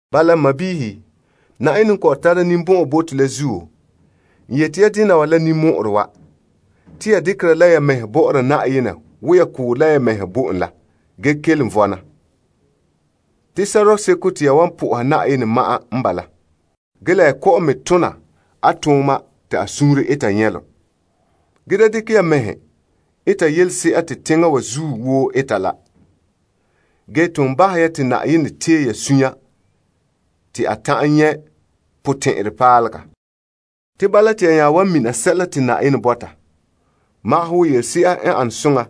Bala, n sɔɔnrɔ, Yenɛ n kɔ'ɔn tara ninbɔn'ɔn bo to la zuo, n yeti ya dena wa la ninmɔ'ɔrɛ wa. Te ya dekera la ya mɛhe bɔ'ɔra Yenɛ wo ya koora la ya mɛhe bɔ'ɔra en la ge kelom vɔna. Te sɔrɔɔ seko te ya wan po'oha Yenɛ ma'an n bala. Ge la ya kɔ'ɔn me tona a tooma te a suunre eta nyɛlom. Ge da dekɛ ya ya mɛhe eta yelese'a te teŋa wa zuo woo eta la. Ge ton bahɛ ya te Yenɛ tee ya suunre te a ta'an nyɛ' potɛn'ɛrɛ paalega. Te bala te ya nya wan mina sɛla te Yenɛ bɔta, wo yelese'a n ane soŋa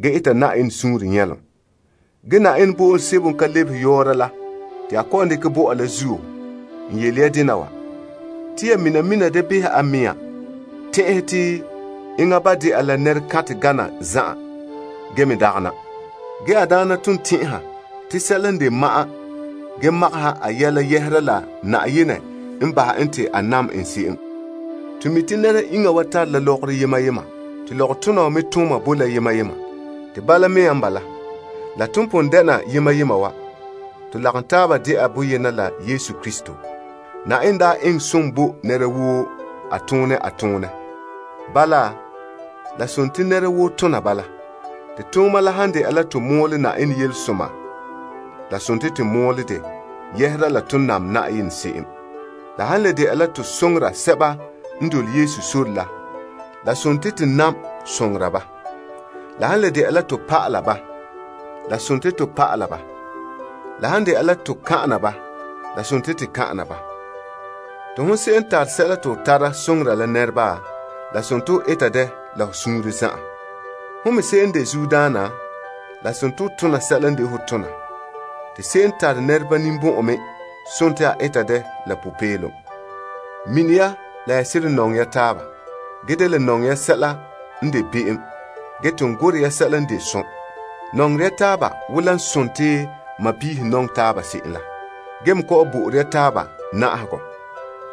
ge eta Yenɛ suunre nyɛlom. Ge Yenɛ bo'olom sebo n ka lebehe yɔɔra la te a kɔ'ɔn dekɛ bɔ'ɔ la zuo, n yele ya dena wa. Te ya mina mina da behɛ a mea tɛn'ɛhɛ, te enŋa ba de'a la nɛrekantɛ gana zan'an ge me dagana. Ge a daana ton tɛn'ɛha te sɛla n de ma'an ge magaha a yɛla yɛhera la Yenɛ n bahɛ en te a nam en se'em. To mi' te nɛra iŋa wa tare la lɔgɔrɔ yema yema te lɔgɔtona wa me tooma boe la yema yema. Te bala mea n bala, bii la te pon dena yema yema wa, to lagom taaba de'a boyena la Yesu Krista. Yenɛ daa eŋɛ som bo nɛra woo a tone a toonɛ. Bala, la sontii nɛra woo tona bala. Te tooma la han de'a la to mɔɔlɛ Yenɛ yelesoma, la dela to mɔɔlɛ dɛ yɛhera la to n nam Yenɛ se'em. La han le de'a la to soŋora sɛba n dole Yesu sore la, la la dela to soŋora ba. La han le de'a la to pa'ala ba, la dela to pa'ala ba. La han de'a la to kan'ana ba, la dela to kan'ana ba. Te hon se'em n tare sɛla te ho tara soŋora la nɛreba, la dela ho eta dɛ la ho suunre zan'an. Ho me se'em de zuodaana, la dela ho tona sɛla n de ho tona. Te se'em n tare nɛreba ninbɔn'ɔn me, la dela a eta dɛ la popeelom. Ge mini ya la ya seren nɔŋɛ ya taaba. Ge da le nɔŋɛ sɛla n de be'em ge ton gorɛ ya sɛla n de som. Nɔŋerɛ ya taaba wo la dela sɔɔnrɔ nɔŋɛ taaba se'em la. Ge me kɔ'ɔn bo'ore ya taaba na'ahegɔ.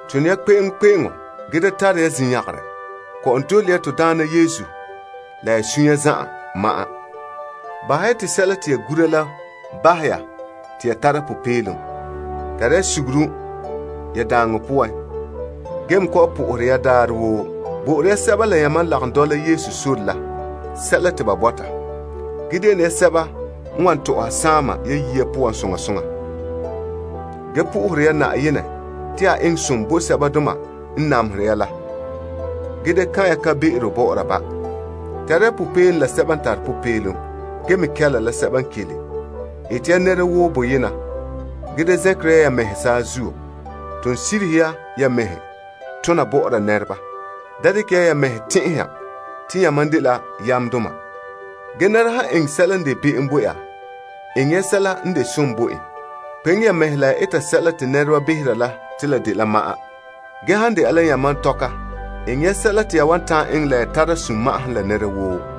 Tone ya kpe'eŋkpe'eŋo ge da tare ya zinyangarɛ kɔ'ɔn dole ya to Daana Yesu, la ya sunya zan'an ma'an. Bahɛ ya te sɛla te ya gura la bahɛ ya te ya tara popeelom. Tare ya suguru ya daaŋɔ poan ge me kɔ'ɔn sohore ya Yenɛ daarɛ woo. Bo'ore ya sɛba la yamam n lagom dɔla Yesu sore la sɛla te ba bɔta. Ge de ne ya sɛba n wan tɔ'ɔha saama ya yiya poan soŋa soŋa. Ge sohore ya Yenɛ te a eŋɛ som bo sɛbadoma n namehere ya la ge da kan'an kan'be'ero bɔ'ɔra ba. Tare ya popeelom la sɛba n tare popeelom. Ge me kɛla la sɛba n kele. Ete ya nɛra woo boyena. Ge da zɛnkere ya mɛhe saazuo, Ge ton sirihe ya ya mɛhe tona bɔ'ɔra nɛreba. Da dekɛ ya ya mɛhe tɛn'ɛha te yamam dela yamdoma. Ge nɛra han eŋɛ sɛla n de be'em bo ya, eŋɛ ya sɛla n de som bo en. Kpeŋe ya mɛhe la ya eta sɛla te nɛreba behera la te la dela ma'an. Ge han de'a la yamam tɔka, eŋɛ ya sɛla te ya wan ta'an eŋɛ la ya tare ya sunma'ahom la nɛra woo.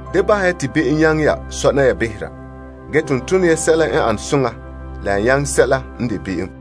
Da bahɛ ya te be'em nyaŋɛ ya sɔna ya behera. Ge ton tone ya sɛla n ane soŋa la ya nyaŋɛ sɛla n de be'em.